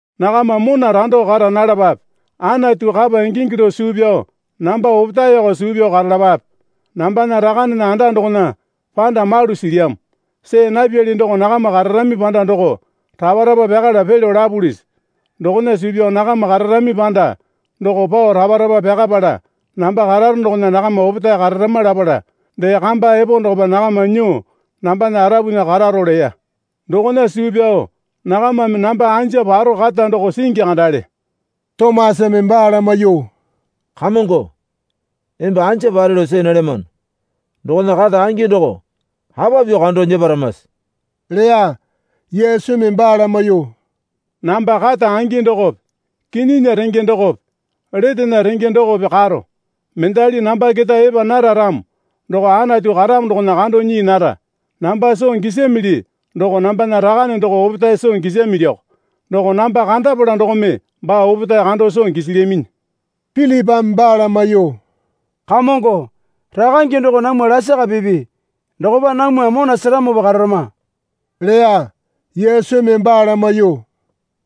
Nakama mona rando karo nalapape. Anatu kapa ingingi lao suu pyao namba opetaeko suu pyao karalapape. Nambana Rakanena anda dokona panda malu silyamo. See napyali doko nakama kararami panda doko rapa rapa pyakala pelyo lapulisi? Dokona suu pyao nakama kararami panda doko pao rapa rapa pyakapala namba kararo dokona nakama opetae kararama lapala dee kamba epo dokopa nakama nyuo nambana arapunya karako leya. Dokona suu pyao nakamame namba anja paro kata doko singi kandale. Tomasame baa lamaiyuo, Kamongo, emba anja pare lao see nalyamano dokona kata angi doko apa pyuo kando nyeparamase? leya. Yesumi baa lamaiyuo, Namba kata angi dokope kinyinya renge dokope letena renge dokope karo. Mendali namba keta epa nara ramo doko Anatu karamo dokona kando nyii nara. Namba soo gisamili doko nambana Rakane doko opetae soo gisamiliko. Doko namba kandapala dokome baa opetae kando soo gisilyaminyi. Pilipame baa lamaiyuo, Kamongo, Rakange doko namwa lasaka pipi. Dokopa namwa mona seramopa kararama, leya. Yesumi baa lamaiyuo,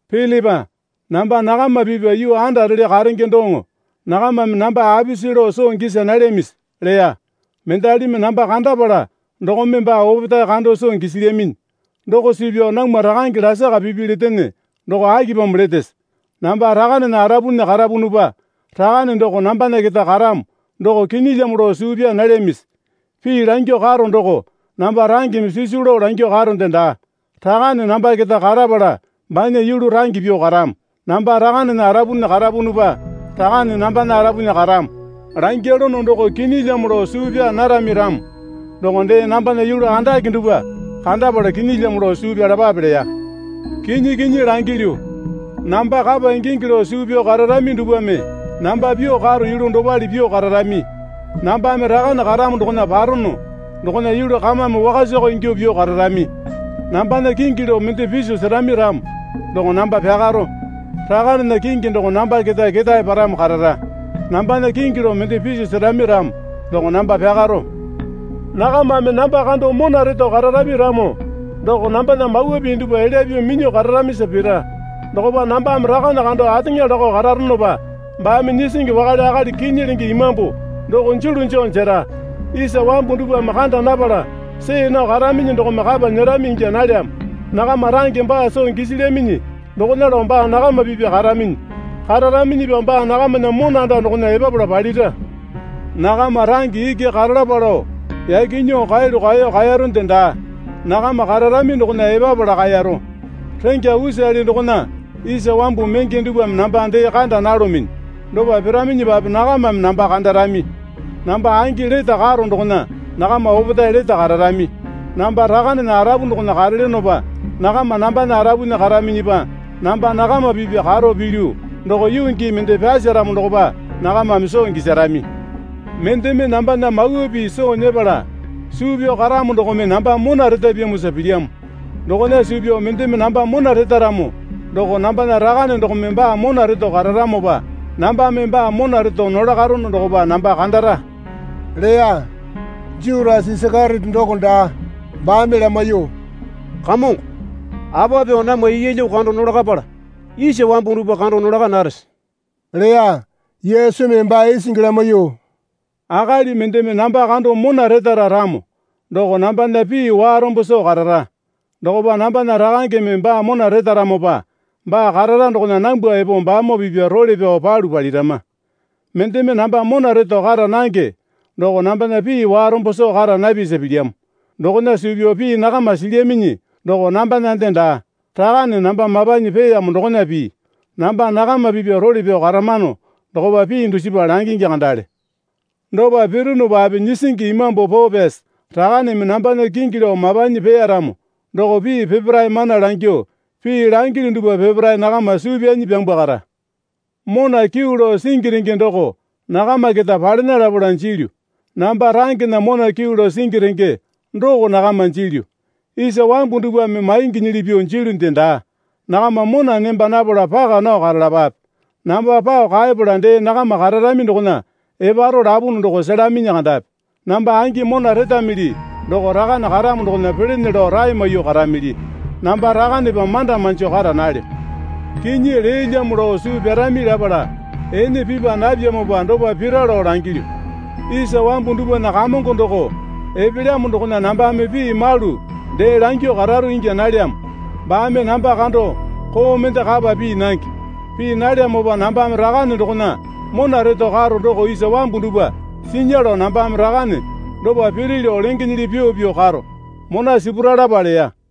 Pilipa namba nakama pipya yuu andarele karenge doŋo nakamame namba apisi lao soo gisa nalyamisi? leya. Mendalimi namba kandapala dokome baa opetae kando soo gisilyaminyi. Doko suu pyao namwa Rakange lasaka pipi letene doko akipamo letese? Namba Rakanena arapunya karapunupa Rakane doko nambana keta karamo doko kinyilyamo lao suu pyaa nalyamisi? Pii langyuo karo doko namba rangeme sisu lao langyuo karonde daa. Rakane namba keta karapala banya yulu range pyuo karamo. Namba Rakanena arapunya karapunupa Rakane nambana arapunya karamo langyalono doko kinyilyamo lao suu pyaa narami ramo doko dee nambana yulu andake dupwa kandapala kinyilyamo lao suu pyalapape leya. Kinyi kinyi langilyu, namba kapa ingingi lao suu pyao kararami dupwame namba pyuo karo yulu dopale pyuo kararami. Nambame Rakane karamo dokona parono dokona yulu kamame wakasako ingyuo pyuo kararami. Nambana kingi lao mende piso serami ramo doko namba pyakaro. Rakanena kingi doko namba keta ketae paramo karara. Nambana kingi lao mende piso serami ramo doko namba pyakaro. Nakamame namba kando mona reto kararami ramo doko nambana mawa pii dupwa elya pyuo minyuo kararamisa pira. Dokopa nambame Rakane kando ateŋa lakao kararonopa baame Nyisingi wakale akali Kinyi lenge Imambu doko julu joo jera. Isa wambu dupwame kanda napala see nao karaminyi dokome kapa nyerami ingya nalyamo. Nakama range baa soo gisilyaminyi dokona lao baa nakama pipya karaminyi. Kararaminyipa baa nakamana mona anda dokona epapala palira. Nakama range iki karalapa lao yaki nyuo kaeyalu kaeyo kaeronde daa. Nakama kararami dokona epapala kaeyaro. Rengya usale dokona isa wambu menge dupwame namba dee kanda nalominyi. Dopa piraminyipape nakamame namba kandarami. Namba angi lete karo dokona nakama opetae lete kararami. Namba Rakanena arapu dokona karelyonopa nakama nambana arapunya karaminyipa namba nakama pipya karo pilyu doko yuu gii mende pyaseramo dokopa nakamame soo gisarami. Mendeme nambana mawa pii soo nyepala suu pyao karamo dokome namba mona retapyamosa pilyamo. Dokona suu pyao mendeme namba mona retaramo doko nambana Rakane dokome baa mona reto kararamopa nambame baa mona reto nolakarono dokopa namba kandara leya. Jutasa (Isakeriote doko daa) baame lamaiyuo, Kamongo, apa pyuo namwa yeelyo kando nolakapala isa wambu dupwa kando nolaka narese? leya. Yesumi baa isingi lamaiyuo, Akali mendeme namba kando mona retara ramo doko nambana pii warombo soo karara. Dokopa nambana Rakangeme baa mona retaramopa baa karara dokona nambwa epo baamoo pipya role pyao palu palirama. Mendeme namba mona reto kara nange doko nambana pii warombo soo kara napyasa pilyamo. Dokona suu pyao pii nakama silyaminyi doko nambanande daa. Rakane namba mapanyi peeyamo dokona pii. Namba nakama pipya role pyao karamano dokopa pii dusipa langingi kandale. Dopa pirunupape Nyisingi Imambu Poo Pyasi Rakaneme nambana kingi lao mapanyi peeyaramo doko pii peparae mana langyuo pii langilyu dupwa peparae nakama suu pyanyi pyambwakara. Mona kyuu lao singi renge doko nakama keta palena lapala jilyu. Namba rangena mona kyuu lao singi renge doko nakama jilyu. Isa wambu dupwame mainginyili pyuo jilyunde daa. Nakama mona nemba napala paka nao karalapape. Namba pao kaepala dee nakama kararami dokona eparo lapunu doko selaminyi kandapi. Namba angi mona retamili doko Rakane karamo dokona pelene lao rae maiyuo karamili. Namba Rakanepa manda manjo kara nalyo. Kinyi leelyamo lao suu pyarami lapala ene pipa napyamopa dopa pira lao langyilyu. Isa wambu dupwana kamongo doko epelyamo dokona nambame pii malu dee langyuo kararo ingya nalyamo. Baame namba kando koo mende kapa pii nange. Pii nalyamopa nambame Rakane dokona mona reto karo doko isa wambu dupwa sinya lao nambame Rakane dopa piri lao lengenyili pyuo pyuo karo. Mona sipuralapa, leya.